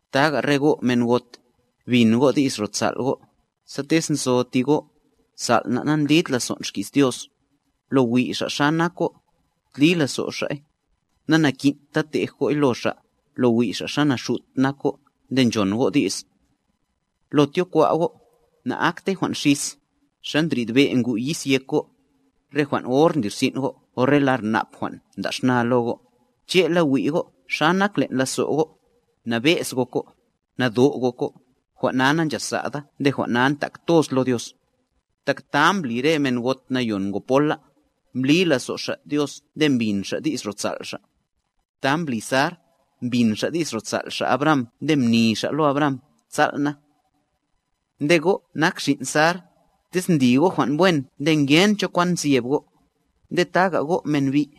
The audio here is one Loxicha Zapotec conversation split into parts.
Taga re go' men got, bin go' di's ro sal' go', sa tez nzo ti go', sal' na' nandlid lazon' xki's Dios, lo wi' xa' xa nak go', tli lazo' xa'y, nanakin'ta tej go'y lo xa', lo wi' xa' naxut nak go' nde nchon go' di's. Lo tyokwa' go' na'aktey jwan' xis, xa ndrid be' ngu' yis yek go', re jwan' or ndlirsin' go' o re lar nap jwan' nda' xna lo go', che'la wi' go' xa nak len' lazo' go', nabe'z gok go', nado' gok go', jwan' na nanchasa'da nde jwan' na ntak toz lo Dios. Tak ta mbli re men got nayon ngo pola, mblí lazo' xa' Dios nde mbin xa' di's ro sal' xa'. Ta mbli Sar, mbin xa' di's ro sal' xa' Abraham nde mni xa' lo Abraham “sal' na”. Nde go' nak xin' Sar, tez ndli go' jwan' wen nde ngen cho kwan nzyeb go'. Nde taga go' men bi',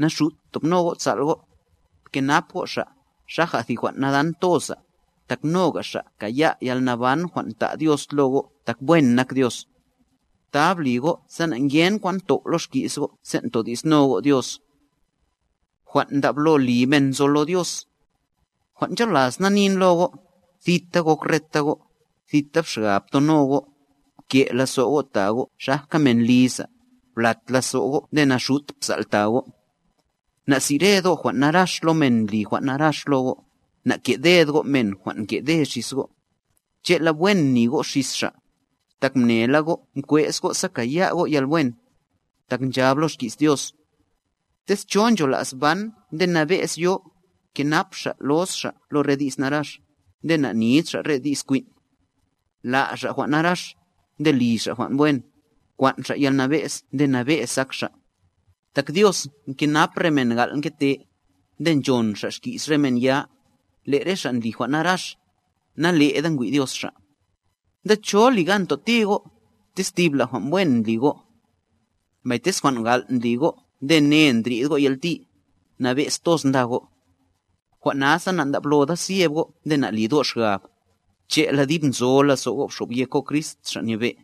naxut btobno go' sal' go'. Pkenap go' xa', xaja thi jwan' nadan toza, tak noga xa' kaya' yalnaban jwan' ta' Dios lo go' tak wen nak Dios. Ta bli go' sa na'ngen kwan tow' lo xki's go' sen' todi'sno go' Dios. Jwan' ncholas na nin lo go', thita gok reta go', tita xgab ptono go', pke' lazo' go' ta go' xajka men liza, blat lazo' go' nde naxut psal' ta go'. Na'sired go' jwan' narax lo men ndli jwan' narax lo go', na'ke'ded go' men jwan' nke'de xis go', che'la wen mni go' xis xa', tak mnela go' mkwe'z go' sa kaya' go' yalwen. Tak nchab lo xki's Dios: Tez cho nchola's ban nde nabe'z yo, kenap xa' los xa' lo re di's narax, nde na'nid xa' re di's kwin'. La' xa' jwan' narax, nde li xa' jwan' wen, kwan' xa' yalnabe'z nde nabe'z ak xa'. Tak Dios nkenap re men gal' nkete, nde nchon Xa' xki's re men ya, Le' re xa' ndli jwan' naraxa, nale'da ngwi' Dios xa'. Nde, ¿cho li gan toti go', tez thibla jwan' wen ndli go'? Mbay tez jwan' gal' ndli go' nde ne ndrid go' yalti, nabe'z toz nda go'. Jwan' nasa nandabloda zyeb go' nde nalid go' xgab, che'la dib nzo lazo' go' bxobyek go' Crist, Xa' Nyebe'.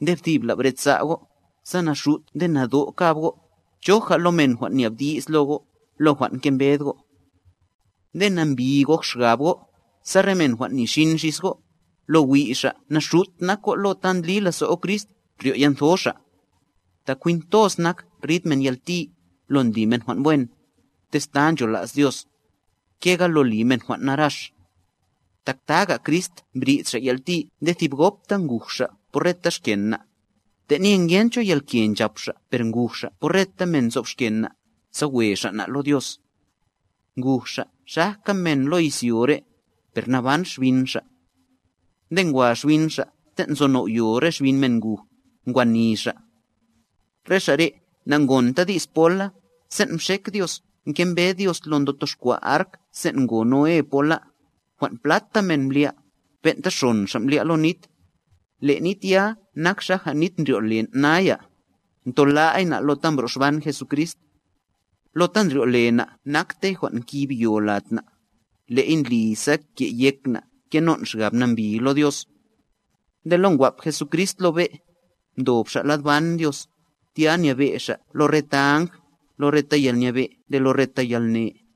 Nde thibla bresa' go', sa naxut nde nado' kab go', choja lo men jwan' nyabdi's lo go', lo jwan' ngembed go'. Nde nambi gok xgab go', sa re men jwan' nixin xis go', lo wi' xa' naxut nak go' lo ta ndli lazo' go' Crist, ryo' yantho xa'. Tak jwin toz nak, rid men yalti, lo ndli men jwan' wen, tez ta nchola's Dios, kega lo li men jwan' narax. Tak taga Crist mbrid Xa' yalti nde ti gobta nguj Xa' por reta xken na', tenye ngen cho yalke nchap Xa' per nguj Xa' por reta men nzob xkena', sa we Xa' na' lo Dios. Nguj Xa' xajka men lo izyo re, per naban xbin Xa'. Nde ngwa xbin Xa' ten' nzo now'yo re xbin men nguj, ngwa nì Xa'. Re xa' re' na'ngonta di's pola, sen' mxek Dios nkembed Dios lo ndotoxkwa' ark sen' ngo Noé pola, jwan' plata men mblya', ben'ta xon xa' mblya' lo nit. Le' nit ya nak xaja nit ndryo'len' naya, ntola'y na' lo ta mbro'xban Jesucrist. Lo ta ndryo'le na' naktey jwan' nkib yo lad na', le'y ndli sa ke'yek na' kenon' xgab nambi lo Dios. Nde lo ngwap Jesucrist lo be', ndob Xa' lad ban Dios, tya nyebe' Xa' lo reta áng, lo reta yalnyebe' nde lo reta yalne.